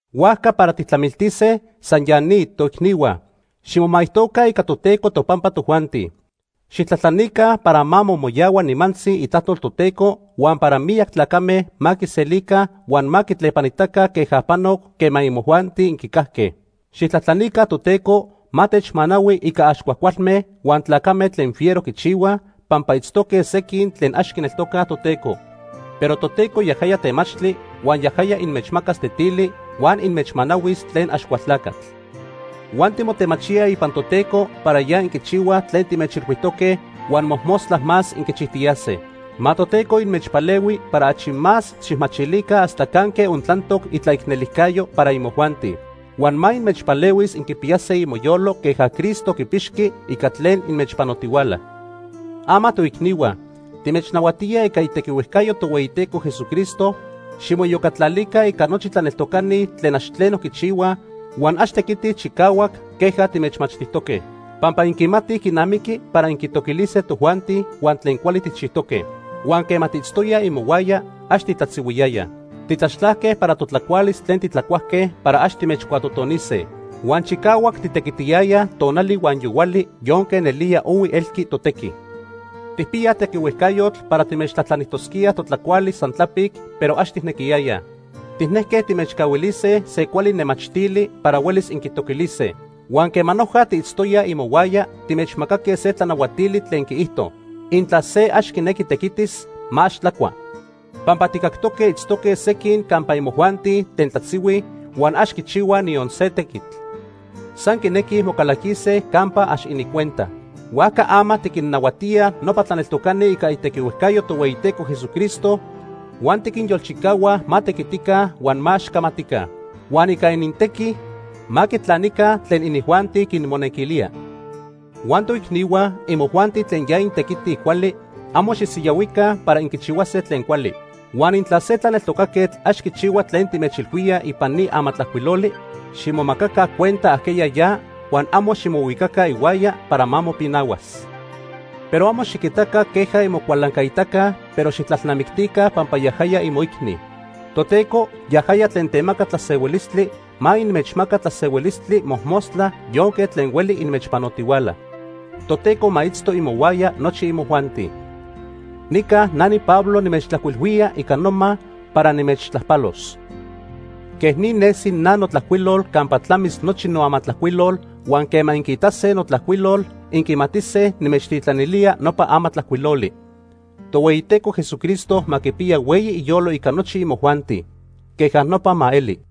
Huajca para tijtlamiltise san ya ni, toicnihua. Ximomaijtoca ica Toteco topampa tojuanti. Xijtlajtlanica para ma momoyahua nimantzi itlajtol Toteco huan para miyac tlacame ma quiselica huan ma quitlepanitaca queja panoc quema imojuanti inquicajque. Xijtlajtlanica Toteco ma techmanahui ica ax cuajcualme huan tlacame tlen fiero quichihuaj, pampa itztoque sequin tlen ax quineltocaj Toteco. Pero Toteco yajaya temachtli huan yajaya inmechmacas tetili huan inmechmanahuis tlen Axcualtlacatl. Huan timotemachíaj ipan Toteco para ya inquichihuaj tlen timechilhuijtoque, huan mojmostla más inquichijtiyase. Ma Toteco inmechpalehui para achi más xijmachilica hasta canque ontlantoc itlaicnelijcayo para imojuanti. Huan ma inmechpalehuis inquipiyase imoyolo queja Cristo quipixqui ica tlen inmechpanotihuala. Ama toicnihua, timechnahuatíaj ica itequihuejcayo Tohueyiteco Jesucristo, ximoiyocatlalica ica nochi tlaneltocani tlen ax tleno quichihuaj huan ax tequitij chicahuac queja timechmachtijtoque. Pampa inquimatij quinamiqui para inquitoquilise tojuanti huan tlen cuali tijchijtoque. Huan quema tiitztoyaj imohuaya, ax titlatzihuiyayaj. Titlaxtlajque para totlacualis tlen tijcuajque para ax timechcuatotonise. Huan chicahuac titequitiyayaj tonali huan yohuali yonque nelía ohui elqui totequi. Tijpiyaj tequihuejcayotl para timechtlajtlanijtosquíaj totlacualis san tlapic, pero ax tijnequiyayaj. Tijnejque timechcahuilise se cuali nemachtili para huelis inquitoquilise. Huan quema noja tiitztoyaj imohuaya timechmacaque se tlanahuatili tlen quiijto: Intla se ax quinequi tequitis, ma ax tlacua. Pampa tijcactoque itztoque sequin campa imojuanti tlen tlatzihuij huan ax quichihuaj niyon se tequitl. San quinequij mocalaquise campa ax inincuenta. Huajca ama tiquinnahuatíaj nopa tlaneltocani ica itequihuejcayo Tohueyiteco Jesucristo huan tiquinyolchicahua ma tequitica huan ma ax camatica. Huan ica inintequi ma quitlanica tlen inijuanti quimonequilía. Huan toicnihua, imojuanti tlen ya intequitij cuali, amo xisiyahuica para inquichihuase tlen cuali. Huan intla se tlaneltocaquetl ax quichihua tlen timechilhuíaj ipan ni amatlajcuiloli, ximomacaca cuenta ajqueya ya huan amo ximohuicaca ihuaya para ma mopinahuas. Pero amo xiquitaca queja inmocualancaitaca, pero xijtlalnamictica pampa yajaya imoicni. Toteco, yajaya tlen temaca tlasehuilistli, ma inmechmaca tlasehuilistli mojmostla yonque tlen hueli inmechpanotihuala. Toteco ma itzto imohuaya nochi imojuanti. Nica na niPablo nimechtlajcuilhuía ica noma para nimechtlajpalos. Quej ni nesi na notlajcuilol campa tlamis nochi noamatlajcuilol, huan quema inquiitase notlajcuilol, inquimatise nimechtitlanilía nopa amatlajcuiloli. Tohueyiteco Jesucristo ma quipiya hueyi iyolo ica nochi imojuanti. Queja nopa ma eli.